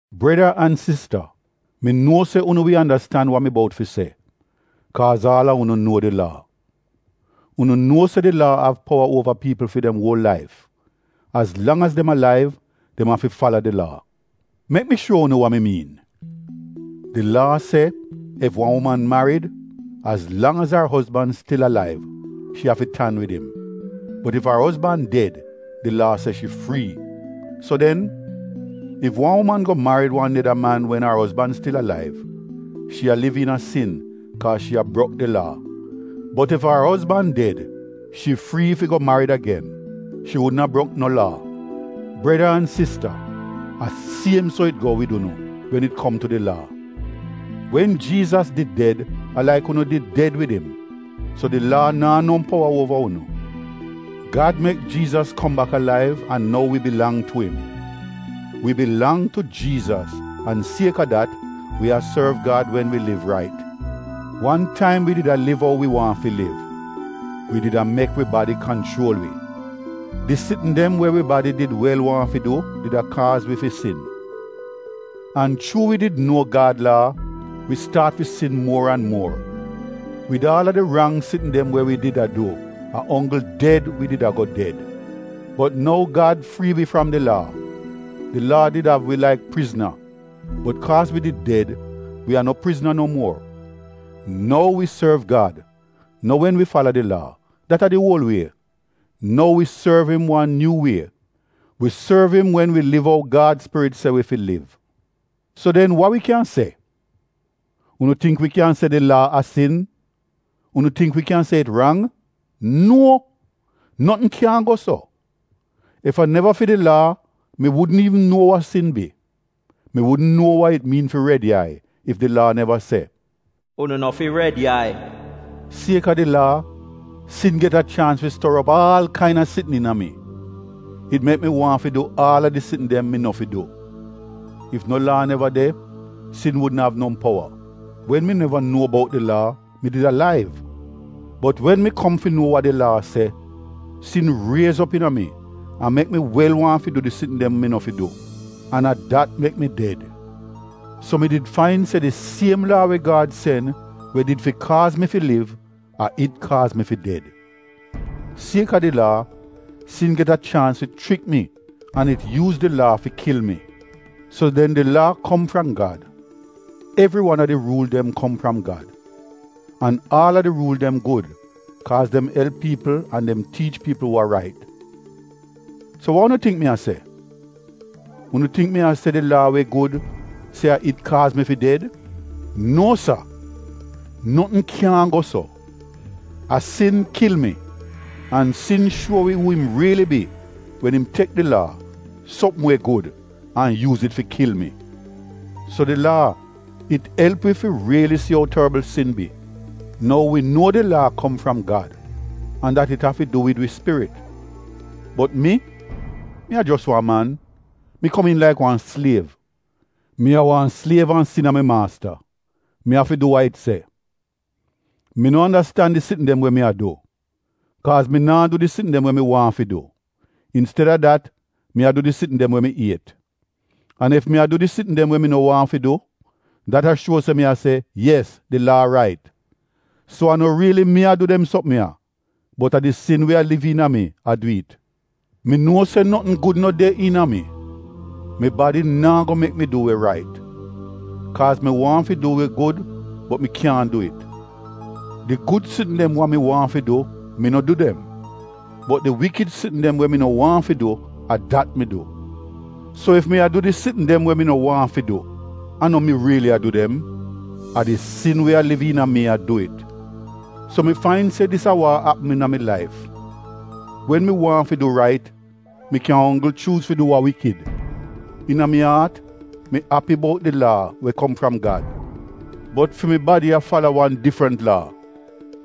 Breda an sista, mi nuo se unu wi andastan wa mi bout fi se, kaaz aal a unu nuo di Laa. Unu nuo se di Laa av powa uova piipl fi dem uol laif — az lang az dem alaiv, dem afi fala di Laa. Mek mi shuo unu wa mi miin. Di Laa se ef wan uman marid, az lang az ar ozban stil alaiv shi afi tan wid im. Bot ef ar ozban ded, di Laa se shi frii. So den, ef wan uman go marid wan neda man wen ar ozban stil alaiv, shi a liv iina sin kaaz shi a brok di Laa. Bot ef ar ozban ded, shi frii fi go marid agen. Shi wudn a brok no Laa. Breda an sista a siem so it go wid unu wen it kom tu di Laa. Wen Jiizas did ded a laik unu did ded wid im, so di Laa naa no powa uova unu. Gad mek Jiizas kom bak alaiv an nou wi bilang tu im. Wi bilang tu Jiizas an sieka dat wi a sorv Gad wen wi liv rait. Wan taim wi did a liv ou wi waahn fi liv — wi did a mek wi badi kanchuol wi. Di sitn dem we wi badi did wel waahn fi du, did a kaaz wi fi sin. An chuu wi did nuo Gad Laa, wi staat fi sin muor an muor. Wid aal a di rang sitn dem we wi did a du a onggl ded wi did ago ded. Bot nou Gad frii wi fram di Laa. Di Laa did av wi laik prizna bot kaaz wi did ded, wi a no prizna no muor. Nou wi sorv Gad, no wen wi fala di Laa, dat a di uol wie, nou wi sorv im wan nyuu wie. Wi sorv im wen wi liv ou Gad Spirit se wi fi liv. So den wa wi kyan se? Unu tingk wi kyan se di Laa a sin? Unu tingk wi kyan se it rang? Nuo! Notn kyaahn go so! Ef a neva fi di Laa mi wudn iivn nuo wa sin bi! Mi wudn nuo wa it miin fi red yai ef di Laa neva se, “Unu no fi red yai.” Sieka di Laa, sin get a chaans fi stor op aal kaina sitn iina mi. It mek mi waahn fi du aal a di sitn dem mi no fi du. Ef no Laa neva de, sin wudn av no powa. Wen mi neva nuo bout di Laa, mi did alaiv. Bot wen mi kom fi nuo wa di Laa se, sin riez op iina mi an mek mi wel waahn fi du di sitn dem mi no fi du, an a dat mek mi ded. So mi did fain se di siem Laa we Gad sen we did fi kaaz mi fi liv, a it kaaz mi fi ded. Sieka di Laa, sin get a chaans fi chrik mi an it yuuz di Laa fi kil mi. So den di Laa kom fram Gad. Evri wan a di ruul dem kom fram Gad. An aal a di ruul dem gud kaaz dem elp piipl an dem tiich piipl wa rait. So wa unu tingk mi a se? Unu tingk mi a se di Laa we gud, se a it kaaz mi fi ded? Nuo sa! Notn kyaahn go so! A sin kil mi. An sin shuo wi uu im riili bi wen im tek di Laa, sopm we gud, an yuuz it fi kil mi. So di Laa, it elp wi fi riili si ou torbl sin bi. Nou wi nuo di Laa kom fram Gad an dat it afi du wid wi spirit. Bot mi, mi a jos wan man. Mi komiin laik wan sliev. Mi a wan sliev an sin a mi maasta — mi afi du wa it se. Mi no andastan di sitn dem we mi a du, kaaz mi naa du di sitn dem we mi waahn fi du. Insteda dat mi a du di sitn dem we mi iet. An ef mi a du di sitn dem we mi no waahn fi du, dat a shuo se mi a se, “Yes, di Laa rait”. So a no riili mi a du dem sopm ya bot a di sin we a liv iina mi a du it. Mi nuo se notn gud no de iina a mi, mi badi naa go mek mi du we rait. Kaaz mi waahn fi du we gud bot mi kyaahn du it. Di gud sitn dem wa mi waahn fi du, mi no du dem. Bot di wikid sitn dem we mi no waahn fi du, a dat mi du. So ef mi a du di sitn dem we mi no waahn fi du, a no mi riili a du dem. A di sin we a liv iina mi a du it. So mi fain se dis a wa a apm iina mi laif. Wen mi waahn fi du we rait, mi kyan onggl chuuz fi du wa iivl. Iina mi aat, mi api bout di Laa we kom fram Gad. Bot fi mi badi a fala wan difrent laa,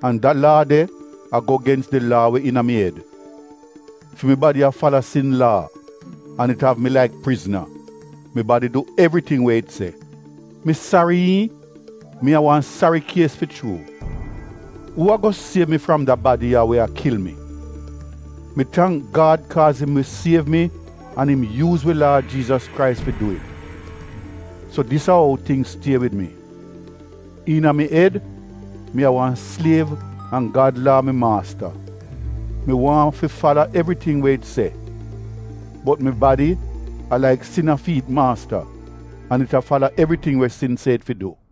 an da laa de a go gens di Laa we iina mi ed. Fi mi badi a fala sin laa, an it av mi laik prizna — mi badi du evriting we it se. Mi sari iihn, mi a wan sari kies fi chuu! Uu ago siev mi fram da badi ya we a kil mi? Mi tangk Gad kaaz im wi siev mi an im yuuz wi Laad Jiizas Krais fi du it. So dis a ou tingz stie wid mi: iina mi ed, mi a wan sliev an Gad Laa a mi maasta. Mi waahn fi fala evriting we it se, bot mi badi, a laik sin a fi it maasta an it a fala evriting we sin se it fi du.